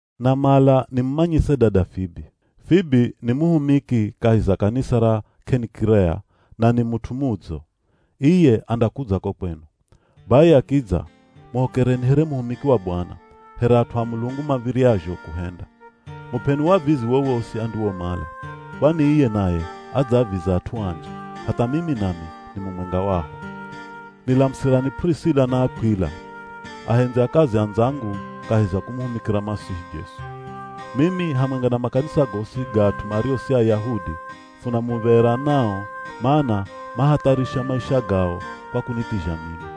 Namala nimumanyise dada Fibi. Fibi ni muhumiki kahi za kanisa ra K'enikirea, na ni mut'u mudzo. Iye andakudza ko kwenu. Bai akidza, muhokereni here muhumiki wa Bwana, here at'u a Mulungu mav̱iryazho kuhenda. Mup'eni wavizi wowosi andiwomala, kwani iye naye adzaaviza at'u anji, hatha mimi nami ni mumwenga waho. Nilamusirani P'urisila na Akw'ila, ahendzi a kazi andzangu kahi za kumuhumikira Masihi Jesu. Mimi hamwenga na makanisa gosi ga at'u mario si Ayahudi funa muv̱era nao mana mahatharisha maisha gao kwa kunithizha mimi.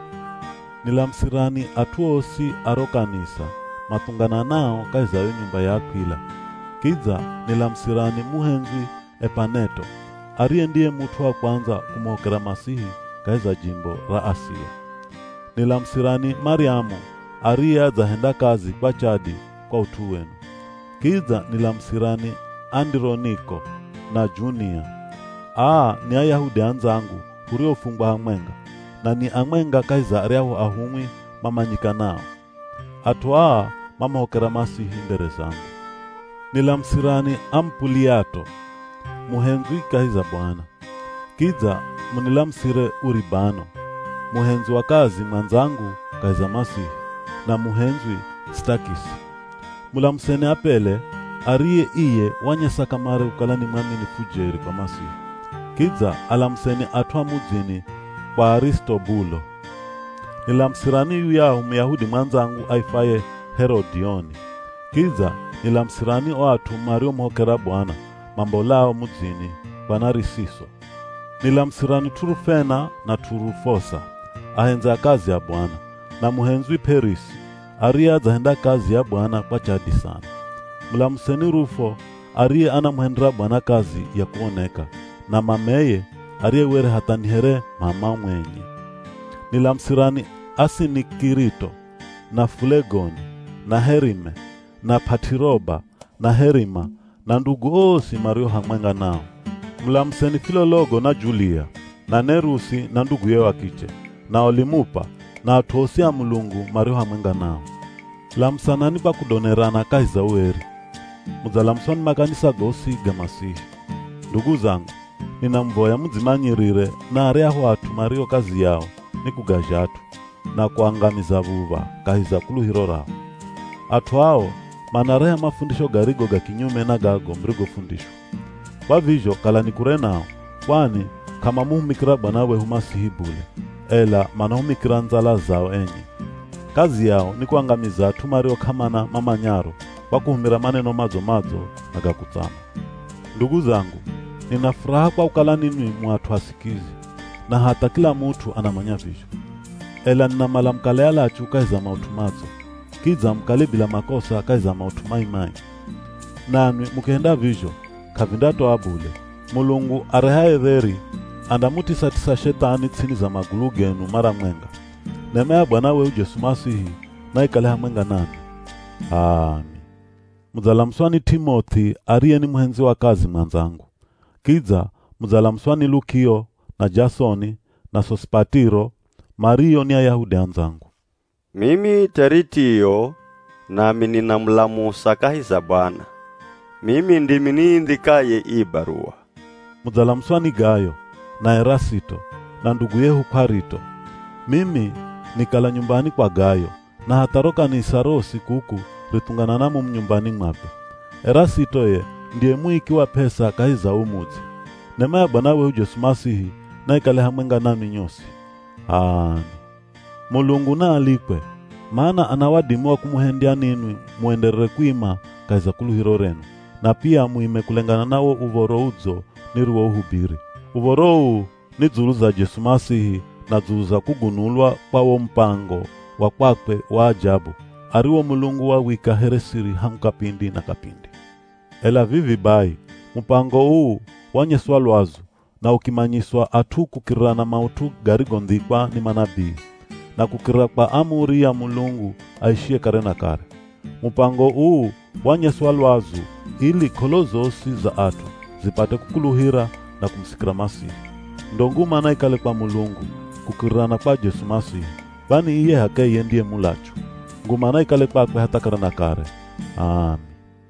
Nilamusirani at'u osi a ro kanisa mathungananao kahi za yo nyumba ya Akw'ila. Kidza nilamusirani muhendzwi Epaneto, ariye ndiye mut'u wa kwandza kumuhokera Masihi kahi za jimbo ra Asia. Nilamusirani Maryamu, ariye adzahenda kazi kwa chadi kwa ut'u wenu. Kidza nilamusirani Andironiko, na Junia. Aa ni Ayahudi andzangu huriofungwa hamwenga, na ni amwenga kahi za aryahu ahumwi mamanyikanao. At'u aa mamuhokera Masihi mbere zangu. Nilamusirani Amupuliato, muhendzwi kahi za Bwana. Kidza munilamusire Uribano, muhendzi wa kazi mwandzangu kahi za Masihi, na muhendzwi Sitakisi. Mulamuseni Apele, ariye iye wanyesa kamare kukala ni mwaminifu jeri kwa Masihi. Kidza alamuseni at'u a mudzini kwa Arisitobulo. Nilamusirani yuyahu Muyahudi mwandzangu aifwaye Herodioni. Kidza nilamusirani o at'u mariomuhokera Bwana, mambolao mudzini kwa Narisiso. Nilamusirani T'urufena na T'urufosa, ahendzi a kazi a Bwana, na muhendzwi P'erisi ariye adzahenda kazi ya Bwana kwa chadi sana. Mulamuseni Rufo, ariye anamuhendera Bwana kazi ya kuoneka, na mameye, ariye were hatha ni here m'ama mwenye. Nilamusirani Asinikirito, na Fulegoni, na Herime, na P'at'iroba, na Herima, na ndugu osi mario hamwenga nao. Mulamuseni Filologo na Julia, na Nerusi na nduguye wa kiche, na Olimupa, na at'u osi a Mulungu mario hamwenga nao. Lamusanani kwa kudonerana kahi za ueri. Mudzalamuswa ni makanisa gosi ga Masihi. Ndugu zangu, ninamuvoya mudzimanyirire na aryahu at'u mario kazi yao ni kugazha at'u, na kuangamiza v̱uv̱a kahi za kuluhiro rao. At'u ao manareha mafundisho garigo ga kinyume na gago murigofundishwa. Kwa vizho kalani kure nao, kwani k'amamuhumikira Bwana wehu Masihi bule, ela manahumikira ndzala zao enye. Kazi yao ni kuangamiza at'u mario k'amana mamanyaro kwa kuhumira maneno madzo-madzo na ga kutsama. Ndugu zangu, nina furaha kwa kukala ninwi mu at'u asikizi, na hatha kila mut'u anamanya vizho. Ela ninamala mukale alachu kahi za maut'u madzo, kidza mukale bila makosa kahi za maut'u mai-mai. Nanwi mukihenda vizho, k'avindatoa bule, Mulungu arehaye dheri andamutisatisa Shethani ts'ini za magulu genu mara mwenga. Nema ya Bwana wehu Jesu Masihi naikale hamwenga nanwi. [H'aami.] Mudzalamuswa ni T'imoth'i ariye ni muhendzi wa kazi mwandzangu. Kidza mudzalamuswa ni Lukio, na Jasoni, na Sosipatiro, mario ni Ayahudi andzangu. Mimi Teritio nami ninamulamusa kahi za Bwana. Mimi ndimi niindhikaye ii baruwa. Mudzalamuswa ni Gayo, na Erasito, na ndugu yehu Kw'arito. Mimi nikala nyumbani kwa Gayo, na hatha ro kanisa rosi kuku rithunganana mumu nyumbani mwakwe. Erasito ye ndiye muiki wa p'esa kahi za uu mudzi. [ Nema ya Bwana wehu Jesu Masihi naikale hamwenga nanwi nyosi. H'aami.] Mulungu naalikwe, mana ana wadimi wa kumuhendya ninwi muenderere kuima kahi za kuluhiro renu, na pia muime kulengana na wo Uv̱oro Udzo niriwohubiri. Uv̱oro uu ni dzulu za Jesu Masihi na dzulu za kugunulwa kwa wo mupango wa kwakwe wa ajabu ariwo Mulungu wawika here siri hangu kapindi na kapindi. Ela vivi bai, mupango uu wanyeswa lwazu, na ukimanyiswa at'u kukirira na maut'u garigondhikwa ni manabii, na kukirira kwa amuri ya Mulungu aishiye kare na kare. Mupango uu wanyeswa lwazu ili k'olo zosi za at'u zipate kukuluhira na kumusikira Masihi. Ndo nguma naikale kwa Mulungu, kukirira na kwa Jesu Masihi, kwani iye h'akeye ndiye mulachu. Nguma naikale kwakwe hatha kare na kare. H'aami.